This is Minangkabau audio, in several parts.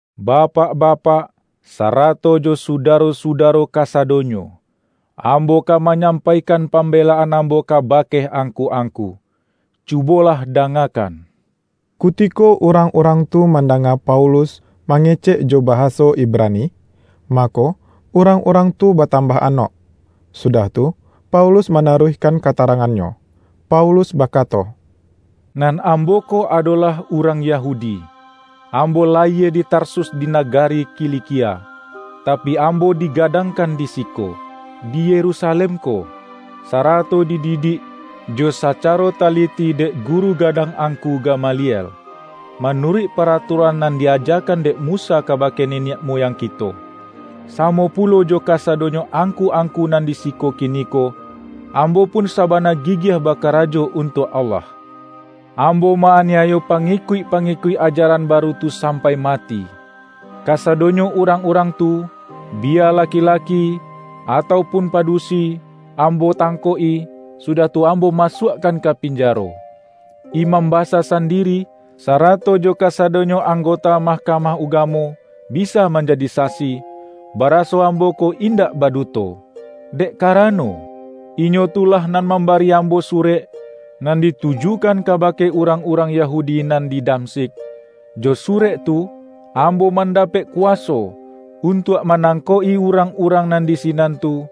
”Bapak-bapak, sarato jo Sudaro-sudaro kasadonyo! Ambo ka manyampaikan pambelaan ambo kabake angku-angku. Cubolah dangakan!” Kutiko urang-urang tu mandanga Paulus mangecekjo bahaso Ibrani, mako, urang-urang tu batambah anok. Sudah tu, Paulus manaruihkan katarangannyo. Paulus bakato,”Nan ambo ko adolah urang Yahudi, ambo layie di Tarsus di nagari Kilikia, tapi, ambo digadangkan di siko, di Yerusalem ko, sarato dididik jo sacaro taliti dek guru gadang angku Gamaliel, manuruik paratuaran nan di-ajakan dek Musa kabake niniak muyang kito. Samo pulo jo kasadonyo angku-angku nan di siko kiniko, ambo pun sabana gigiah bakarajo untuak Allah. Ambo ma-aniayo pangikuik-pangikuik ajaran baru tu sampai mati. Kasadonyo urang-urang tu, biya laki-laki, atau pun padusi, ambo tangkok-i, sudah tu ambo masuakkan ka pinjaro. Imam basa sandiri, sarato jo kasadonyo anggota Mahkamah Ugamo, bisa manjadi sasi, baraso ambo ko indak baduto. Dek karano, inyo tu lah nan mambari ambo surek, nan ditujukan kabake urang-urang Yahudi nan di Damsyik. Jo surek tu, ambo mandapek kuwaso untuak manangkok-i urang-urang nan di sinan tu,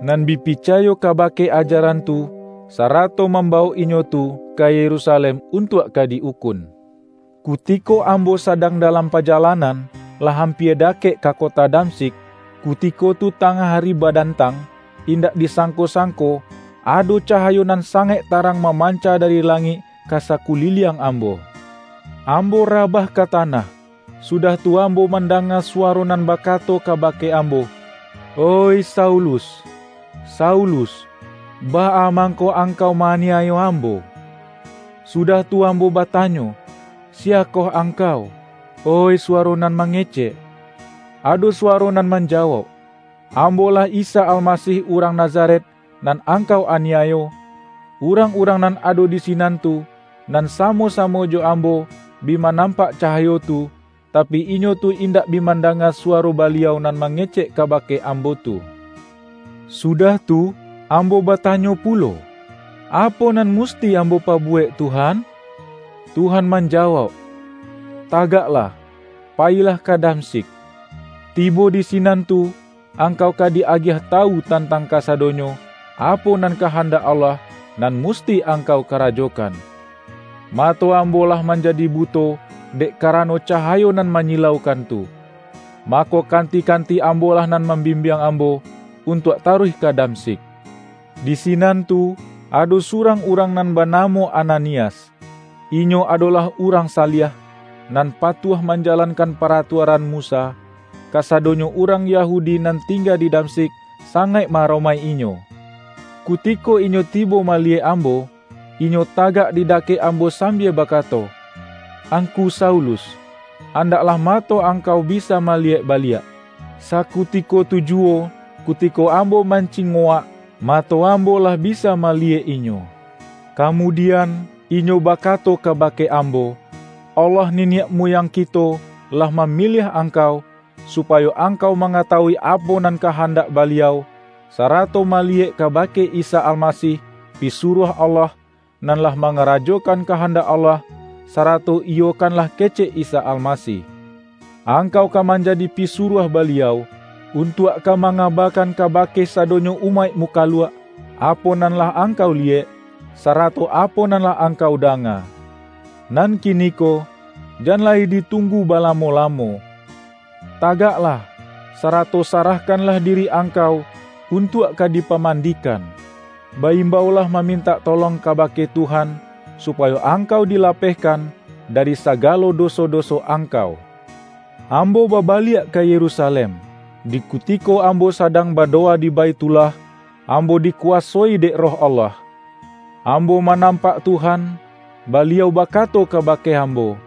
nan bi picayo kabake ajaran tu, sarato mambawok inyo tu ka Yerusalem, untuak ka di-ukun.” ”Kutiko ambo sadang dalam pajalanan, lah ampia dakek ka kota Damsyik, kutiko tu tangah ari badantang, indak disangko-sangko ado cahayo nan sangaik tarang mamanca dari langik ka sakuliliang ambo. Ambo rabah ka tanah, sudah tu ambo mandanga suwaro nan bakato kabake ambo, ’Oih Saulus, Saulus! Baa mangko angkau ma-aniayo Ambo?' Sudah tu ambo batanyo, ’Siyakoh Angkau, oih suwaro nan mangecek?' Ado suwaro nan manjawauk, ’Ambo-lah Isa Almasih urang Nazaret, nan angkau aniayo,' Urang-urang nan ado di sinan tu, nan samo-samo jo ambo, bi manampak cahayo tu, tapi, inyo tu indak bi mandanga suwaro Baliau nan mangecek kabake ambo tu. Sudah tu, ambo batanyo pulo, ’Apo nan musti ambo pabuwek, Tuhan?' Tuhan manjawauk, ’Tagaklah, payilah ka Damsyik. Tibo di sinan tu, angkau ka di-agiah tawu tantang kasadonyo, apo nan kahandak Allah, nan musti angkau karajokan.’ Mato ambo lah manjadi buto, dek karano cahayo nan manyilaukan tu. Mako kanti-kanti ambolah nan mambimbiang ambo, untuak taruih ka Damsyik. Di sinan tu, ado surang urang nan banamo Ananias. Inyo adolah urang saliah, nan patuah manjalankan paratuaran Musa. Kasadonyo urang Yahudi nan tingga di Damsyik, sangaik ma-aromaik-inyo. Kutiko inyo tibo maliyek ambo, inyo tagak di dakek ambo sambia bakato, ’Angku Saulus, andaklah mato angkau bisa maliyek baliak!' Sakutiko tu juwo, kutiko ambo mancingowak, mato ambo lah bisa maliyek inyo. Kamudian, inyo bakato kabake ambo, ’Allah niniak muyang kito, lah mamiliah angkau, supayo angkau mangatawui apo nan kahandak Baliau, sarato maliyek kabake Isa Almasih, Pisuruah Allah, nan lah mangarajokan kahandak Allah, sarato iyokanlah kecek Isa Almasih. Angkau ka manjadi pisuruah Baliau, untuak ka mangabakan kabake sadonyo umaik mukaluak, apo nan lah angkau liyek, sarato apo nan lah angkau danga. Nan kiniko, jan lai ditunggu balamo-lamo. Tagaklah, sarato sarahkanlah diri angkau untuak ka dipamandikan. Ba-imbaulah mamintak tolong kabake Tuhan, supayo angkau dilapehkan dari sagalo doso-doso angkau.’” ”Ambo babaliak ka Yerusalem, di kutiko ambo sadang badowa di Baithullah, ambo dikuwasoi dek Roh Allah. Ambo manampak Tuhan; Baliau bakato kabake ambo,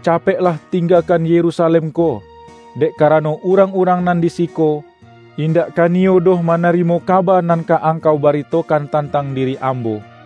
’Capeklah tinggakan Yerusalem ko, dek karano urang-urang nan di siko, indak ka niyo doh manarimo kaba nan ka angkau baritokan tantang diri Ambo.’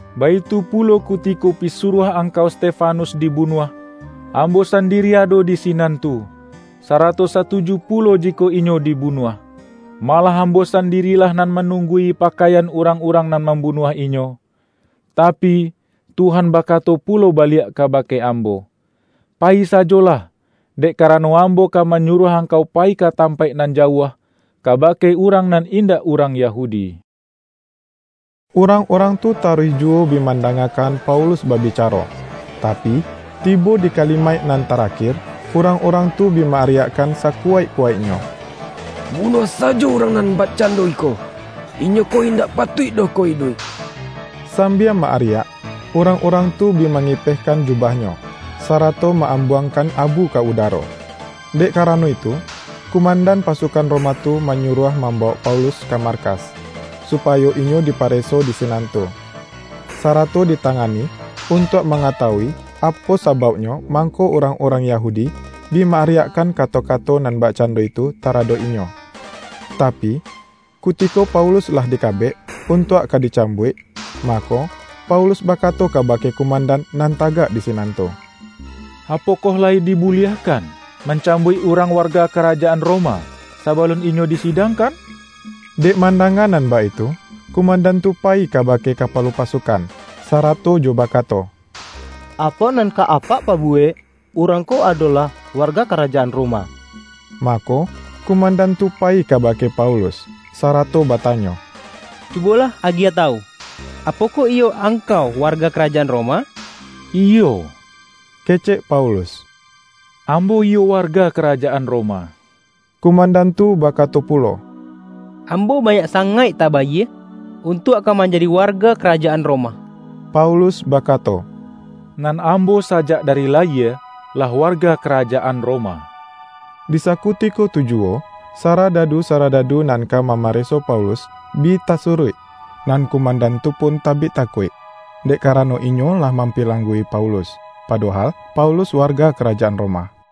Baitu pulo kutiko pisuruah Angkau Stefanus dibunuah, ambo sandiri ado di sinan tu, sarato satuju pulo jikok inyo dibunuah. Malah ambo sandirilah nan manunggui pakaian urang-urang nan mambunuah inyo.’ Tapi, Tuhan bakato pulo baliak kabake ambo, ’Payi sajolah, dek karano Ambo ka manyuruah angkau payi ka tampaik nan jauah, kabake urang nan indak urang Yahudi.’” Urang-urang tu taruih juwo bi mandangakan Paulus babicaro, tapi, tibo di kalimaik nan tarakir, urang-urang tu bi ma-ariakkan sakuwaikkuwaiknyo,”Bunuah sajo urang nan bakcando iko. Inyo ko indak patuik doh ko iduik!” Sambia ma-ariak, urang-urang tu bi mangipehkan jubahnyo, sarato ma-ambuangkan abu ka udaro. Dek karano itu, kumandan pasukan Roma tu manyuruah mambawok Paulus ka markas, supayo inyo dipareso di sinan tu, sarato ditangani, untuak mangatawui apo sabauknyo mangko urang-urang Yahudi bi ma-ariakkan kato-kato nan bakcando itu taradok inyo. Tapi, kutiko Paulus lah dikabek, untuak ka dicambuik, mako, Paulus bakato kabake kumandan nan tagak di sinan tu,”Apokoh layi dibuliahkan, mancambuik urang warga karajaan Roma, sabalun inyo disidangkan?” Dek mandanga nan baitu, kumandan tu payi kabake kapalo pasukan, sarato jo bakato,”Apo nan ka apak pabuwek? Urang ko adolah warga karajaan Roma!” Mako, kumandan tu payi kabake Paulus, sarato batanyo,”Cubolah agiah tawu, apokoh iyo angkau warga karajaan Roma?””Iyo,” kecek Paulus,”ambo iyo warga karajaan Roma.” Kumandan tu bakato pulo,”Ambo banyak sangaik tabayie, untuak ka manjadi warga karajaan Roma!” Paulus bakato,”Nan ambo sajak dari layie, lah warga karajaan Roma.” Di sakutiko tu juwo, saradadu-saradadu nan ka mamareso Paulus, bi tasuruik, nan kumandan tu pun tabik takuik, dek karano inyo lah mampilanggu-i Paulus, padohal Paulus warga karajaan Roma.